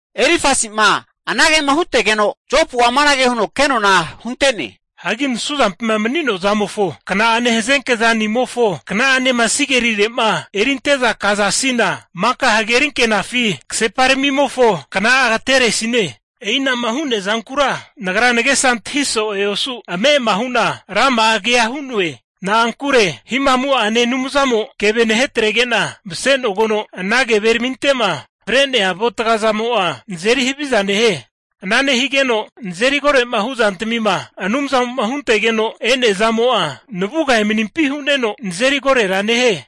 Elifasi'ma anagema hutegeno Jopu'a amanage huno kenona hunte'ne. Hagi nasuzampima mani'noa zamofo kna'ane hazenke zani'amofo kna'anema sigerire'ma erinte'za kazasina, maka hagerinkenafi kaseparamimofo kna'a agateresine. E'inama hu'nea zankura nagra nagesa antahi so'e osu ame'ama hu'na rama'a kea hu'noe. Na'ankure Hihamu'ane Anumzamo'a keve nahetrege'na masenogeno ana keveraminte'ma fre'nea avuatga zamo'a nazeri haviza nehie. Ana nehigeno nazeri koro'ma hu'zantamima Anumzamo'ma huntegeno e'nea zamo'a navuga emanimpi huneno nazeri korora nehie.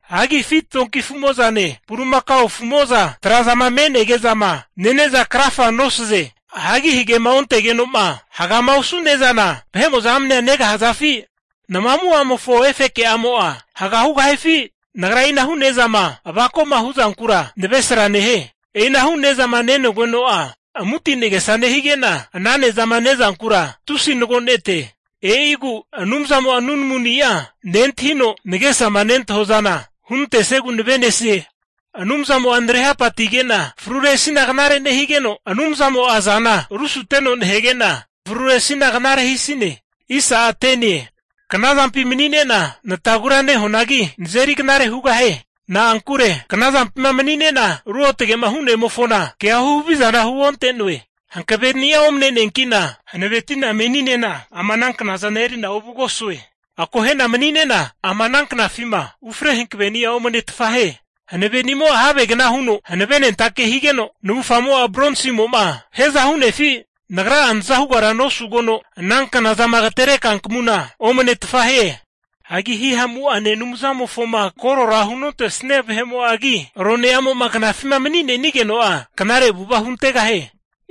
Hagi afi donki afu'mo'zane bulimakao afu'mo'za trazama me'nege'zama nene'za krafa nosaze. Hagi hagema ontegeno'ma hagama osu ne'zana vahe'mo'za amnea negahazafi? Nama amu'amofo efeke'amo'a haga hugahifi? Nagra e'inahu' ne'zama avako'ma hu'zankura navresra nehie. E'inahu ne'zama nenogeno'a, amuti nagesa nehige'na ana nezama ne'zankura tusi nagonete. E'igu Anumzamo'a nunamuni'a nentahino, nagesama nentahua zana hunantesiegu nave'nesie. Anumzamo'a nare hapati'nige'na fruresina knare nehigeno, Anumzamo'a azana rusuteno nahege'na fruresina knare hisine. Knazampi mani'ne'na natagura nehuanagi, nazeri knare hugahie. Na'ankure knazampima mani'ne'na Ruotge'ma Hu'nemofona kea huhavizana huonte'noe. Hankave'ni'a omne'neanki'na hanaveti'na mani'ne'na ama ananknazana eri'na ovugosue. Akohena mani'ne'na ama ana knafima ufre hankaveni'a omnetfa hie. Hanavenimo'a havegna huno hanavenentake higeno, navufgamo'a bronsimo'ma hiaza hu'nefi? Hagi nagra'a naza hugara nosugeno, ama ana knazama agatere kankmuna omnetfa hie. Hagi Hihamu'ane Anumzamofoma korora hunontesnia vahe'mo'agi, rone'amo'ma knafima mani'nenigeno'a knare avu'ava huntegahie.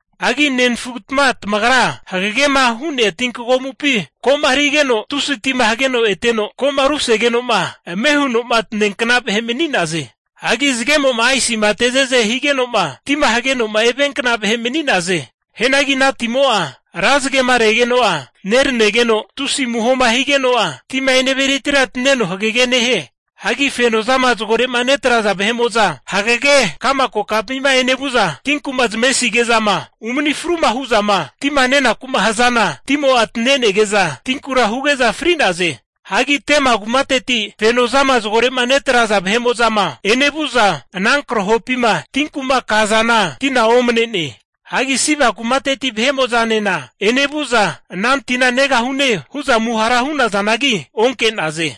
Hagi nenafugatma tamagra, hagegema hu'nea tinkagomupi ko'ma rigeno tusi tima hageno eteno, ko'ma rusegeno'ma ame huno'ma taneankna vahe mani'naze. Hagi zagemo'ma aisima teze'ze higenoma, tima hageno'ma eviankna vahe mani'naze. Hianagi ana timo'a ra zagema regeno'a neranegeno, tusi amuhoma higeno'a, tima eneviretira taneno hagege nehie. Hagi fenozama zagorema netraza vahe'mo'za (Karivani) hagege ka'ma kokampima enevu'za tinku'ma zamavesige'zama umani fru hu'zama tima nenaku'ma hazana, timo'a tanenege'za tinkura huge'za fri'naze. Hagi Tema kumateti fenozama zagore'ma netraza vahe'mo'zama enevu'za ana krahopima tinku'ma kazana tina omnene. Hagi Siba kumateti vahe'mo'zanena enevu'za ana tina negahune hu'za amuhara hu'nazanagi onke'naze.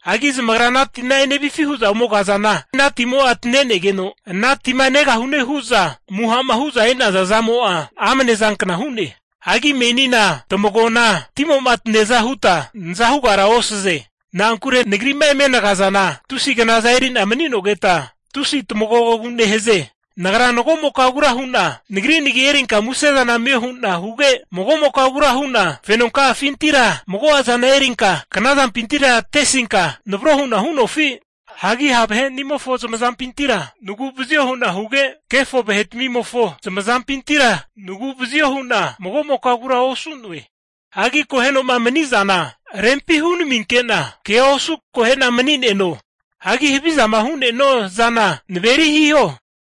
Hagi zamagra ana tina enevifi hu'zama ome kazana ana timo'a tanegeno, ana tima negahunema hu'za amuha'ma hu'za e'naza zamo'a amnezankna hu'ne. Hagi menina tamagoana timoma taneaza huta naza hugara osaze. Na'ankure nagri'ma eme nagazana, tusi knaza eri'na mani'nogeta, tusi tamagogogu nehaze. Nagra mago'mokagura hu'na nagri nagi erinka muse'za amio hu'na huge, magomokagura hu'na fenonka'afintira mago'azana erinka knazampintira atesinka navro hu'na hu'nofi? Hagi ha' vahe'nimofo zamazampintira nagu'vazio hu'na huge, kefo vahetmimofo zamazampintira nagu'vazio hu'na mago'mokagura osu'noe. Hagi akoheno'ma mani'zana rempi hunaminke'na kea osu' akohe'na mani'neno. Hagi havizama hu'ne'nua zana naveri hiho.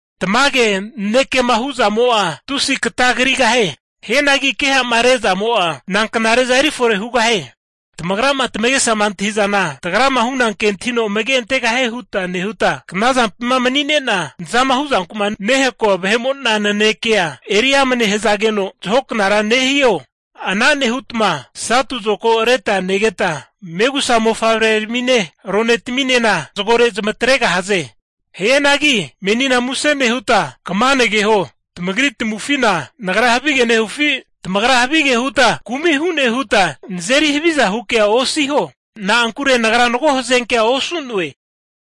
Tamage nanekema hu'zamo'a tusi katagrigahie. Hianagi keha'ma rezamo'a, nanknare'za erifore hugahie? Tamagrama tamagesa antahi'zana, tagrama huna ke antahino amage antegahie huta nehuta, knazampima mani'ne'na nazama huzanku'ma nehakoa vahe'mo'na nanekea eri amne hazageno zahoknara nehio? Ana nehutma satu zokago reta negeta, megusa mofavreramine, ronetaminena zagore zamatregahaze. Hianagi menina muse nehuta kama nageho, tamagri tamavufina nagra havige nehufi? Tamagra havigea huta kumi hune huta nazeri haviza hu kea osiho. Na'ankure nagra mago hazenkea osu'noe.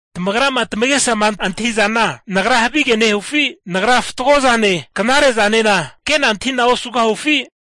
Tamagrama tamagesama antahi'zana, nagra havige nehufi? Nagra fatgo zane knare zanena ke'na antahi'na osugahufi?